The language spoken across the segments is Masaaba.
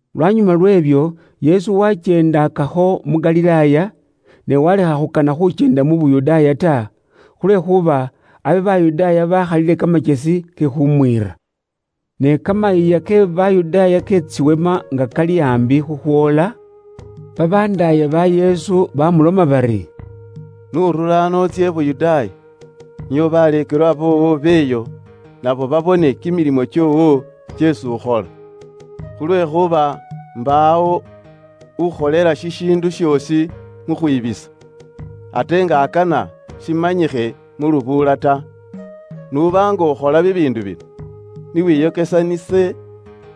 Lwanyuma lw'ebyo, Yesu waakyeendakakho mu Galilaaya, ne waalekha khukana khuukyenda mu Yuda ta, khulwekhuuba abe Bayudaaya baakhalile kamakyesi ke khuumwiira. Ne kamayiiya ke Bayudaaya ke Tsiweema nga kali aambi khukhwoola, babandaaye ba Yesu baamuloma bari, “N'urure ano utsye i Yuda, nio baleekelwa boowo b'eyo nabo babone kimilimo kyoowo kyeesi ukhola. Khulwekhuuba mbaawo ukholela shishiindu shoosi mu khwibisa, ate nga akana shimanyikhe mu lubuula ta. N'uba nga ukhola bibiindu bino, ni wiyokesanise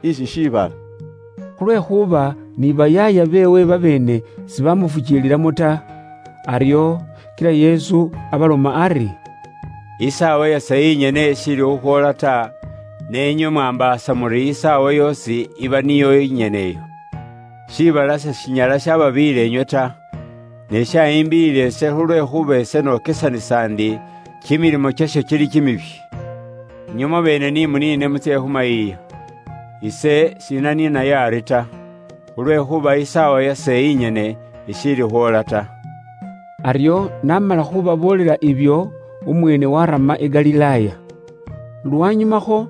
isi shiibala.” Khulwekhuuba ni bayaaya beewe babeene sibaamufukiililamo ta. Aryo kila Yesu abaloma ari, “Isaawa yase inyene ishiili khukhwoola ta, ne inywe mwaambaasa muri isaawa yoosi iba niyo inyene iyo. Shiibala seshinyala shababiiyila inywe ta. Ne shayimbiiyila ise khulwekhuuba ise nokesanisa ndi kimilimo kyasho kili kimibi. Inywe mwabeene ni muniine mutsye khu mayiiya. Ise s'inaniinayo ari ta. Khulwekhuuba isaawa yase inyene ishiili khwoola ta.” Aryo n'amala khuubaboolela ibyo, umweene waarama i Galilaaya. Lwanyumakho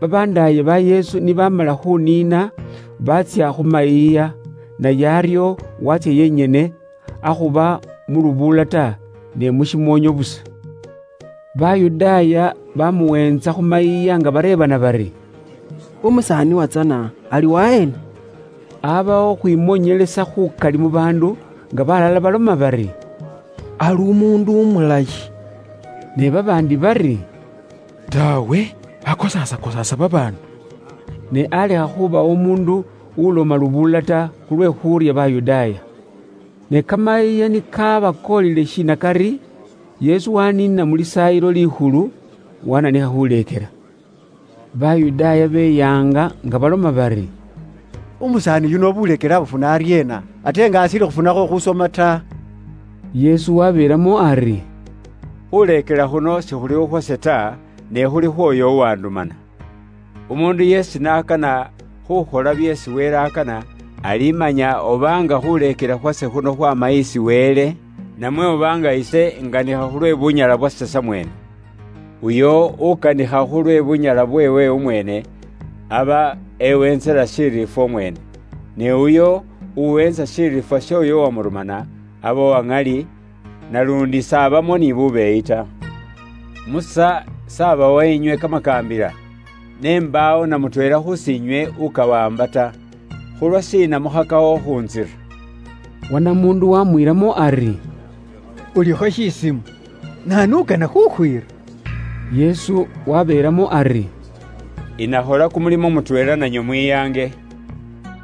babandaaye ba Yesu ni baamala khuuniina baatsya khu mayiiya, naye aryo waatsya yenyene, akhuba mu lubuula ta, ne mu shimoonyo busa. Bayudaaya baamuweentsa khu mayiiya nga bareebana bari, “Umusaani uwatsana ali waheena?” Aabawo khukhwimoonyelesa khukali mu baandu, nga balala baloma bari, “Ali umuundu umulayi,” ne babaandi bari, “Taawe, akosaasakosaasa babaandu.” Ne alekha khubawo umuundu uloma lubuula ta, khulwe khuurya Bayudaaya. Ne kamayiiya ni kaaba koolile shinakari, Yesu waaniina mu Lisaayilo Likhulu, wananikha khuleekela. Bayudaaya beyaanga nga baloma bari, “Umusaani yuno buleekele buno abufuna aryeena, ate nga ashiili khufunakho khusoma ta?” Yesu waabeelamo ari: “Khuuleekela khuno sikhuli khukhwase ta, ne khuli khwoyo uwandumana. Umuundu yeesi n'akana khuukhola byeesi Wele akana, alimanya oba nga khuleekela khwase khuno khwaama isi Wele, namwe oba nga ise inganikha khulwe bunyala bubwase samweene. Uyo ukanikha khulwe bunyala bubweewe umweene, aba ewentsela shiriifwa umweene. Ne uyo uweetsa shiriifwa sh'oyo uwamurumana, aba uwa ŋali, naluundi s'abamo ni bubwoonaki ta. Musa s'abawa inywe kamakaambila? Ne mbaawo namutweela khus'inywe ukawaamba ta. Khulwashiina mukhakakho khukhuntsira?” Wanamuundu waamwiilamo ari, “Iwe ulikho kimisaambwa! Naanu ukana khukhwiira?” Yesu waabilamo ari: “Inakhola kumulimo mutweela nanywe mwiyange.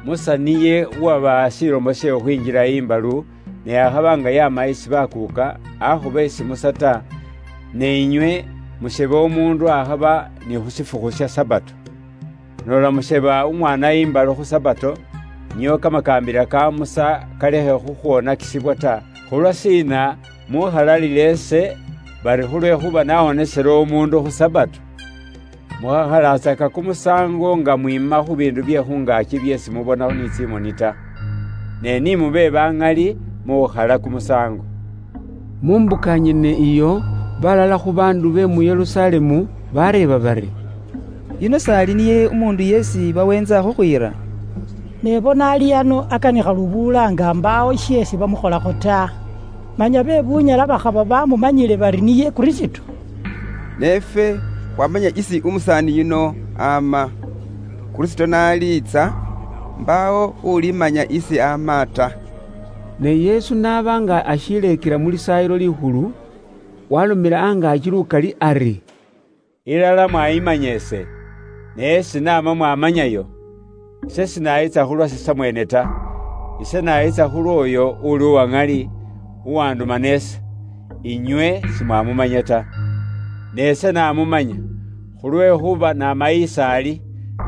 Musa niye uwabawa shilomo she khukhwinjila imbalu (ne akhaba nga yaama isi baakuuka, akhuba isi Musa ta), ne inywe musheba umuundu akhaba ni khu shifukhu sha Sabato. Noola musheba umwaana imbalu khu Sabato, nio kamakaambila ka Musa kalekhe khukhwonakisibwa ta, khulwashiina muukhalalila ise bari khulwekhuuba nawonesele umuundu khu Sabato? Mukhakhalatsaka kumusaango nga mwiima khu biindu bye khu ngaaki byeesi mubona ni tsimoni ta, ne ni mube baŋali mu khukhala kumusaango.” Mu mbuka nyene iyo, balala khu baandu be mu Yerusalemu baareeba bari, “Uyuno s'ali niye umuundu esi baweentsa khukhwiira? Ne bona ali ano akanikha lubuula nga mbaawo sheesi bamukholakho ta. Inyala khuuba iri bawuli ilala bamanyile nga niye Kristo? Ne ifwe kwamanya isi umusaani yuno ama. Kristo n'aliitsa, mbaawo ulimanya isi ama ta.” Ne Yesu n'aba nga ashileekela mu Lisaayilo Likhulu, waalomela angaaki lukali ari, “Ilala mwayimanya ise? Ni esi naama mwamanyayo? Ise sinayitsa khu lwase samweene ta. Ise nayitsa khu lwooyo uli uwa ŋali, uwandumana ise. Inywe simwamumanya ta. Ne ise namumanya, khulwekhuuba naama is'ali,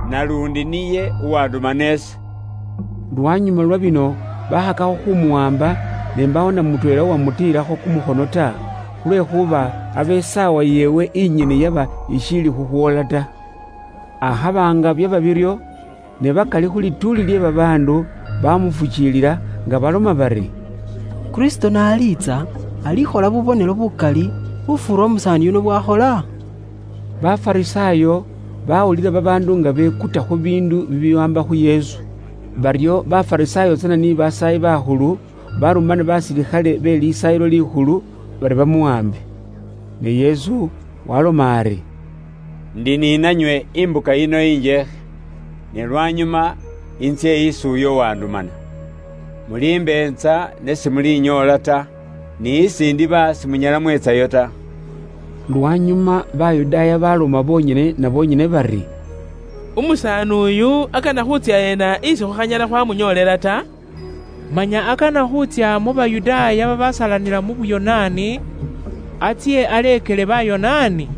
naluundi niye uwandumana ise.” Lwanyuma lwa bino bakhakakho khumuwaamba, ne mbaawo namutweela uwamutiilakho kumukhono ta, khulwekhuuba abe isaawa yeewe inyene yaba ishiili khukhwoola ta. Akhaba nga byaba biryo, ne bakali khu lituuli lye babaandu bamufukiilila, nga baloma bari, “Kristo n'aliitsa, alikhola bubonelo bukali khufuura umusaani yuno bwakhola?” Bafarisaayo bawulila babaandu nga bekuta khu biindu bibiwaamba khu Yesu. Baryo Bafarisaayo tsana ni Basaayi bakhulu barumana basilikhale be Lisaayilo Likhulu, bari bamuwaambe. Ne Yesu waaloma ari, “Indi ni nanywe imbuka yino injeekhe, ne lwanyuma intsye isi uyo uwandumana. Mulimbeetsa ne simulinyoola ta, ni isi ndiba simunyala mwetsayo ta.” Lwanyuma Bayudaaya baloma bonyene na bonyene bari, “Umusaani uyu akana khuutsya ena isi khukhanyala khwamunyoolela ta? Manya akana khuutsya mu Bayudaaya babasalanila mu Buyonaani, atsye aleekele Bayonaani?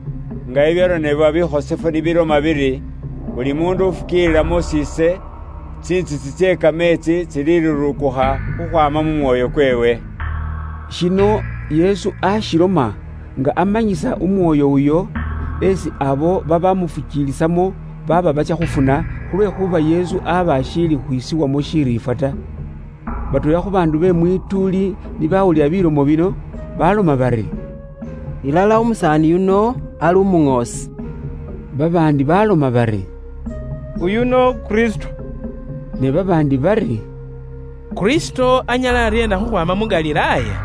Nga bibyaronebwa bikhosefu ni biloma biri, ‘Buli muundu ufukiilila mus'iise, tsintsitsi tsye kameetsi tsilirurukukha khukhwaama mu mwoyo kweewe.’” Shino Yesu ashiloma nga amanyisa Umwoyo uyo, esi abo babamufukiilisamo baaba batsya khufuna, khulwekhuuba Yesu aba ashiili khwisibwamo shiriifwa ta. Batweela khu baandu be mwituuli ni bawulila bilomo bino, baloma bari, “Ilala umusaani yuno ali umuŋoosi.” Babaandi baloma bari, “Uyuno Kristo,” ne babaandi bari, “Kristo anyala aryeena khukhwaama mu Galilaaya?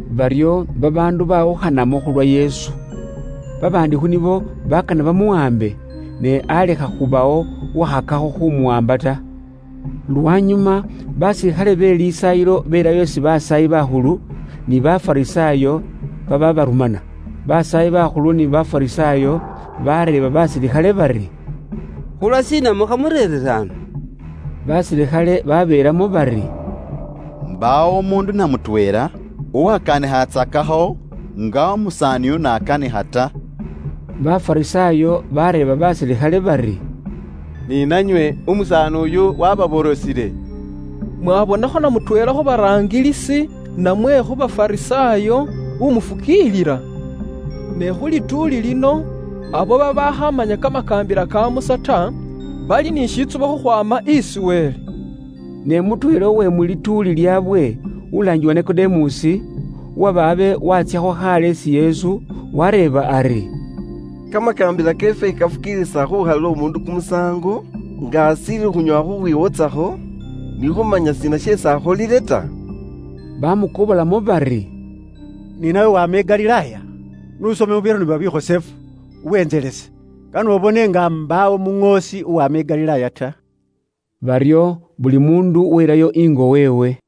Baryo babaandu bawukhanamo khulwa Yesu. Babaandi khu nibo bakana bamuwaambe, ne alekha khubawo uwakhakakho khumuwaamba ta. Lwanyuma basilikhale be Lisaayilo belayo isi basaayi bakhulu, ni Bafarisaayo babaabarumana. Basaayi bakhulu ni Bafarisaayo bareeba basilikhale bari, “Khulwashiina mukhamureerire ano?” Basilikhale babeelamo bari, “Mbaawo umuundu na mutweela uwakanikhatsakakho nga umusaani uyu n'akanikha ta!” Bafarisaayo bareeba basilikhale bari, “Ni nanywe umusaani uyu wababorosile? Mwabonakho na mutweela khu baraangilisi, namwe khu Bafarisaayo umufukiilila? Ne khu lituuli lino, abo babaakhamanya kamakaambila ka Musa ta, bali ni shitsubo khukhwaama isi Wele.” Ne mutweela uwe mu lituuli lyaabwe, ulaangibwa Nikodemusi, uwaba abe waatsyakho khaale isi Yesu, wareeba ari, “Kamakaambila keefwe kafukiilisa khukhalila umuundu kumusaango, nga ashiili khunyoowa khukhwiwotsakho, ni khuumanya shiina sheesi akholile ta?” Baamukobolamo bari, “Ni nawe waama i Galilaaya? N'usome mu byaronebwa bikhosefu, uwentselese, kane ubone nga mbaawo umuŋoosi uwaama i Galilaaya ta.” Baryo buli muundu welayo ingo weewe.